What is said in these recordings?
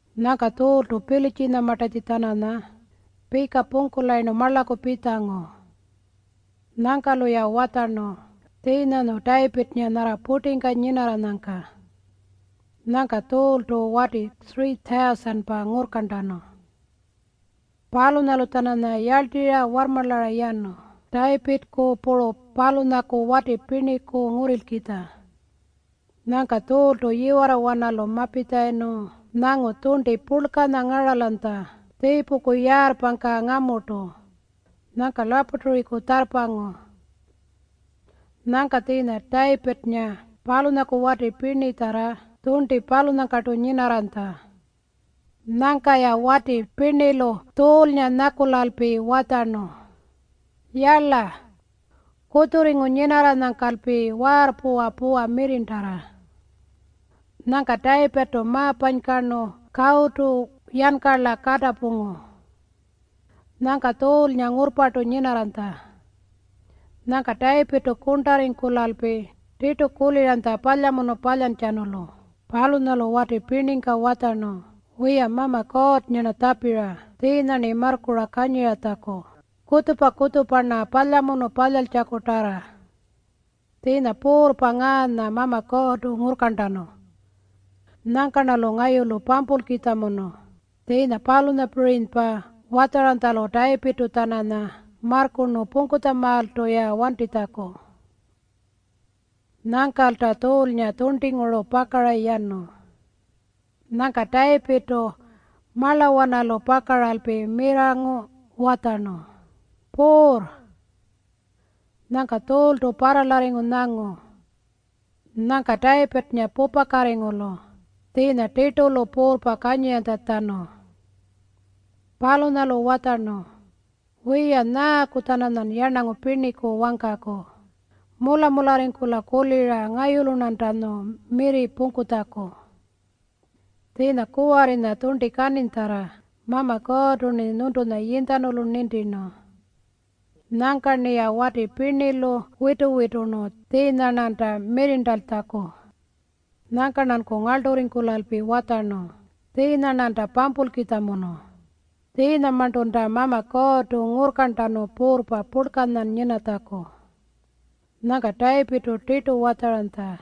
Nyangka Tjuultu Pilitjinyamartatji-tjananya pika pungkulayirnu marlaku pitjangu. Nyangka-luya watjarnu tjiinyanyu Tayipirrnga nyarra purtingka nyinarranyangka. Nyangka Tjuultu wati 3,000-pa ngurrkarntanu. Palunyalu-tjananya yarltirra warrmarlara yanu Tayipirrku puru palunyaku wati pirniku ngurrilkitja. Nyangka Tjuultu yiwarrawanalu mapitjalayirnu nyangu tjurnti purlkanya ngaralanytja tjiipuku yaarrpangka ngamurtu. Nyangka lapaturiku tjarrpangu. Nyangka tjiinya Tayipirrnga palunyaku wati pirnitjarra tjurnti palunyangkartu nyinarranytja. Nyangka-ya wati pirnilu Tjuulnga nyakulalpi watjarnu, “Yala, kutjurringu nyinarranyangkalpi waarrpuwa puwa mirrirntarra.” Nyangka Tayipirrtu ma-panykarnu kawutu yankarla katapungu. Nyangka Tjuulnga ngurrpartu nyinarranytja. Nyangka Tayipirrtu kurntarringkulalpi tirtu kuliranytja palyamunu palyantjatjanulu. Palunyalu wati pirningka watjarnu, “Wiya, Mama Kuurrnga-rna tjapira tjiinya-rni marrkura kanyiratjaku kutjupa-kutjupa-rna palyamunu palyaltjakutarra. Tjiinya puurrpa ngaanya Mama Kuurrtu ngurrkarntanu. Nyangka-rnalu ngayulu pampulkitjamunu.” Tjiinya palunyapirinypa watjaranytjalu Tayipirrtu-tjananya marrkurnu pungkutjamaaltu wantitjaku-ya. Nyangkalta Tjuulnga tjurntinguru pakara yanu. Nyangka Tayipirrtu marlawanalu pakaralpi mirrangu watjarnu, “Puurr!” Nyangka Tjuultu parralarringu nyangu. Nyangka Tayipirrnga pupakatingu-lu tjiinya tirtu-lu puurrpa kuliranytjatjanu. Palunyalu watjarnu, “Wiya, nyaaku-tjananyan yarnangu pirniku wangkaku mula-mularringkula kulira ngayulu-rnantanyu mirri pungkutjaku? Tjiinya, kuwarrinya tjurnti kaninytjarra Mama Kuurrtu-rni nyuntunya yinytjanulu nintirnu. Nyangka-rniya wati pirnilu witu-witurnu tjiinya-rnanta mirrirntankutjaku. Nyangka-rnanku ngarlturringkulalpi watjarnu tjiinya-rnanta pampulkitjamunu. Tjiinyamarntunta Mama Kuurrtu ngurrkarntanu puurrpa purlkanyan nyinatjaku.” Nyangka Tayipirrtu tirtu watjaranytja,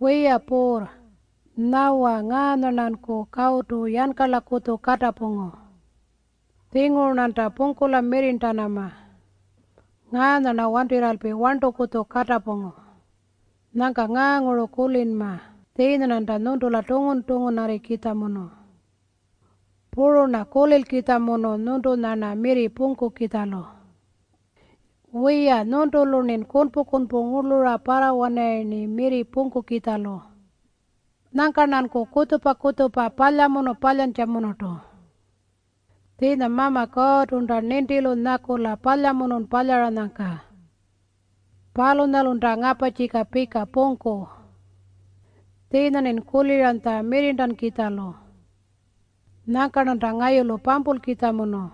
“Wiya puurr, nyawa ngaanya-rnanku kawutu yankarlakutju katapungu. Tjinguru-rnanta pungkula mirrirntanama. Ngaanya-rna wantirralpi warntukutju katapungu. Nyangka ngaanguru kulinma tjiinya-rnanta nyuntula tungun-tungunarrikitjamunu. Puru-rna kulilkitjamunu nyuntunya-rna mirri pungkukitjalu. Wiya, nyuntulu-rnin kunpu-kunpu ngurlura parrawanarayirni mirri pungkukitjalu. Nyangka-rnanku kutjupa-kutjupa palyamunu palyantjamunurtu. Tjiinya Mama Kuurrtunta nintilu nyakula palyamunun palyaranyangka. Palunyalunta ngaparrtjika pika pungku. Tjiinya-rnin kuliranytja mirrirntankukitjalu. Nyangka-rnanta ngayulu pampulkitjamunu.”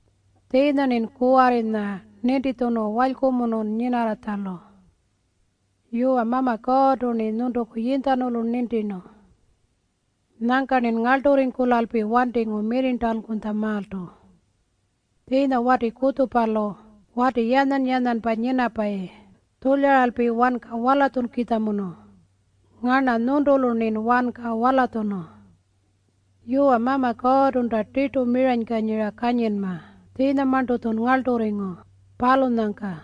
Tjiinya-rnin kuwarrinya nintitjunu walykumunun nyinarranytjalu. Yuwa, Mama Kuurrtu-rni nyuntuku yinytjanulu nintirnu. Nyangka-rnin ngarlturringkulalpi wantingu mirrirntankutjamaaltu. Tjiinya wati kutjupalu wati yanyan-yanyanpa nyinapayi tjulyaralpi wanka walatjunkukitjamunu. Ngarna nyuntulu-rnin wanka walatjunu. Yuwa, Mama Kuurrtunta tirtu miranykanyira kanyinma tjiinyamarntu-tjun ngarlturringu, palunyangka.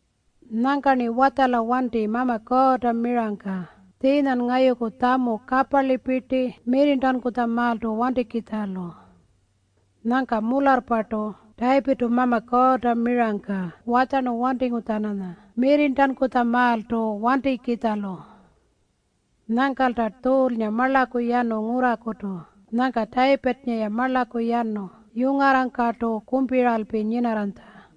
Nyangka-rni watjala wanti Mama Kuurrta mirangka tjiinyan ngayuku tjamu kaparlipirti mirrirntankutjamaaltu wantikitjalu.” Nyangka mularrpartu Tayipirrtu Mama Kuurrta mirangka watjarnu wantingu-tjananya mirrirntankutjamaaltu wantikitjalu. Nyangkalta Tjuulnga marlaku yanu ngurrakutu. Nyangka Tayipirrnga-ya marlaku yanu yungarrangkartu kumpiralpi nyinarranytja.